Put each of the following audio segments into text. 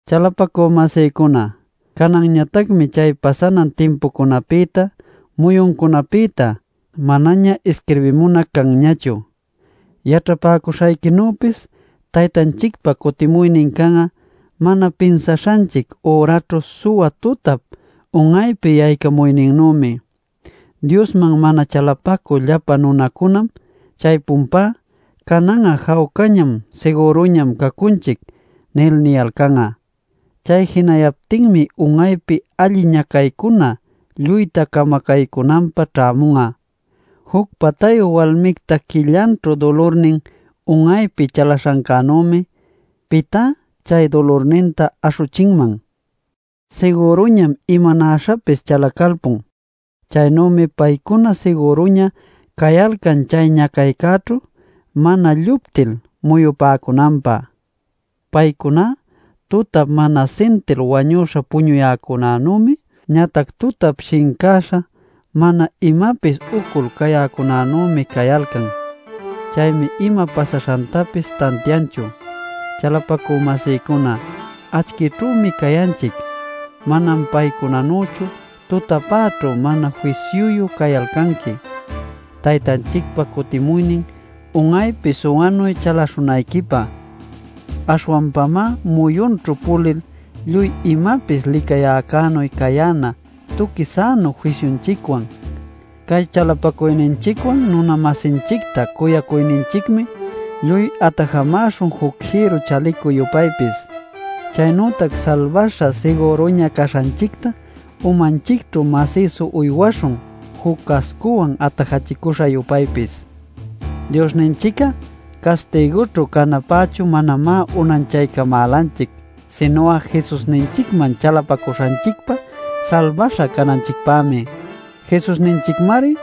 Chalapacü-masïcuna, cananñatacmi chay pasanan timpucunapïta, muyuncunapïta, manaña isquirbimunac canñachu. Yaćhapäcuśhayquinüpis, Taytanchicpa cutimuynin can'a mana pinsaśhanchic üraćhu suwa tutap un'aypi yaycamuyninnümi. Diosman mana chalapacü llapa nunacunam chaypunpá “Canan'a jawcañam sigüruñam cacunchic” nil niyalcan'a. Chay jinayaptinmi un'aypi alli ñacaycuna lluyta camacänanpä ćhämun'a. Juc patayu walmicta quillanćhu dulurnin un'aypi chalaśhancänümi ¿pitá chay dulurninta aśhuchinman? Sigüruñam imanäśhapis chalacalpun. Chaynümi paycuna sigüruña cayalcan chay ñacaycäćhu mana lluptil muyupäcunanpä. Paycuná tutap mana sintil wañüśha puñuyäcunanümi, ñatac tutap shincäśha mana imapis ucul cayäcunanümi cayalcan. Chaymi ima pasaśhantapis tantianchu. Chalapacü-masïcuna, acchïćhümi cayanqui. Manam paycunanüchu tutapäćhu mana fisyuyu cayalcanqui Taytanchicpa cutimuynin un'aypi suwanuy chaläśhunayquipä. Aśhwanpamá, muyunćhu pulil lluy imapis licäcunänuy cayäna tuqui sänu fisyunchicwan. Cay chalapacuyninchicwan nuna-masinchicta cuyaycuyninchicmi lluy atajamäśhun juc jïrru chalicu-yupaypis. Chaynütac salbäśha sigüruña caśhanchicta umanchicćhu masïsu uywaśhun juc cascuwan atajachicüśha-yupaypis. Diosninchic'a castigućhu canapächu manamá unanchaycamälanchic, sinu'a Jesusninchicman chalapacuyninchicpa salbaśha cananchicpämi. Jesusninchicmari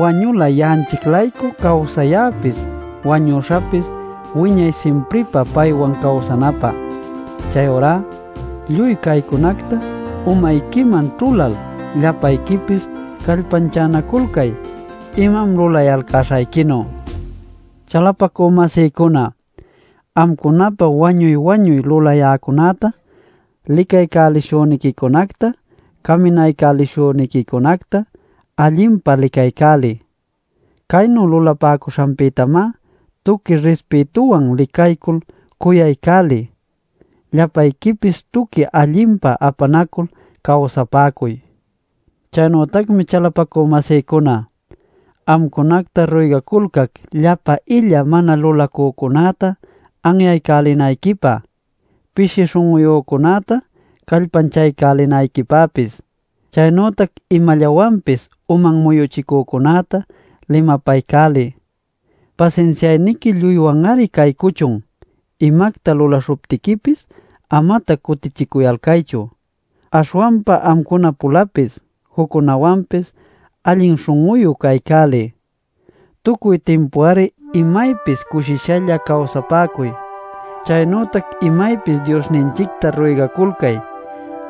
wañula ya'anchic-laycu cawsayäpis wañuśhäpis wiñay simpripä paywan cawsacunapä. Chayurá lluy caycunacta umayquiman ćhulal llapayquipis callpanchanaculcay imam lulayalcäśhayquinu. Chalapacü-masïcuna, amcunapä wañuy-wañuy lulayäcunäta, licaycälishüniquicunacta, caminaycälishüniquicunacta allinpa licaycäliy. Caynu lulapäcuśhanpïtamá tuqui rispïtuwan licaycul cuyaycäliy. Llapayquipis tuqui allinpa apanacul cawsapäcuy. Chaynütacmi chalapacü-masïcuna, amcunacta ruygaculcac, llapa illa mana lulacücunäta anyaycälinayquipä, pishi śhun'uyücunäta callpanchaycälinayquipäpis. Chaynütac imallawanpis uman muyuchicücunäta limapaycäliy. Pasinsiayniqui lluywan-ari caycuchun. Imacta lulaśhuptiquipis amatac cutichicuyalcaychu. Aśhwanpa amcuna-pulapis juccunäwanpis allin śhun'uyu caycäliy. Tucuy timpu-ari imaypis cushishalla cawsapäcuy. Chaynütac imaypis Diosninchicta ruygaculcay.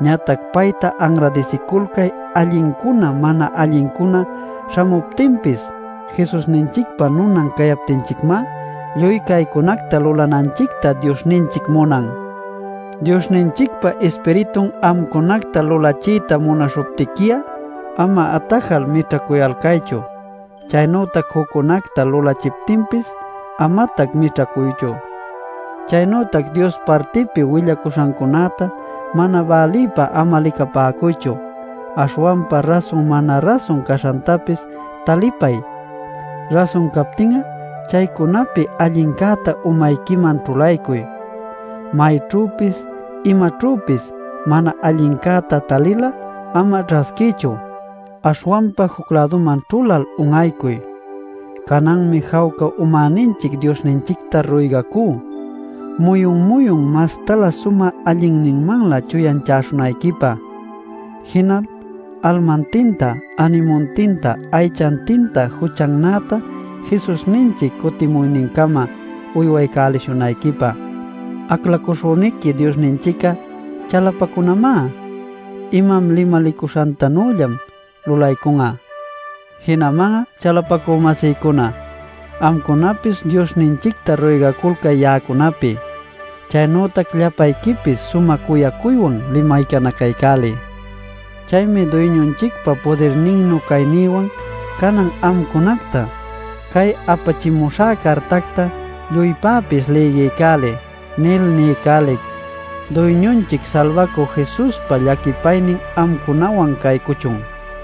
Ñatac payta anradisiculcay allincuna mana allincuna śhamuptinpis. Jesusninchicpa nunan cayaptinchicmá lluy caycunacta lulananchicta Diosninchic munan. Diosninchicpa Ispiritun amcunacta lulachiyta munaśhuptiqui'a ama atajal mićhacuyalcaychu. Chaynütac juccunacta lulachiptinpis amatac mićhacuychu. Chaynütac Dios partipi willacuśhancunäta mana bälïpä ama licapäcuychu. Aśhwanpa rasun mana-rasun caśhantapis talipay. Rasun captin'a chaycunapi allincäta umayquiman ćhulaycuy. Mayćhüpis imaćhüpis mana allincäta talil'a ama ćhasquiychu. Aśhwanpa juc-läduman ćhulal un'aycuy. Cananmi jawca umäninchic Diosninchicta ruygacú muyun-muyun mastalä sumä allinninmanlä chuyanchäśhunayquipä, jinal almantinta änimuntinta aychantinta juchannäta Jesusninchic cutimuynincama uywapäcuśhunayquipä. Aclacuśhüniqui Diosninchic'a chalapacunamá. Imam limalicuśhantanüllam lulaycun'a. Jinaman'a, chalapacü-masïcuna, amcunapis Diosninchicta ruygaculcay ya'acunapi. Chaynütac llapayquipis sumä cuyacuywan limaycanacaycäliy. Chaymi Duyñunchicpa pudirninnu caynïwan canan amcunacta “Cay apachimuśhä cartacta lluypäpis lïgiycäliy” nil niycälic. Duyñunchic Salbacü Jesuspa llaquipaynin amcunawan caycuchun.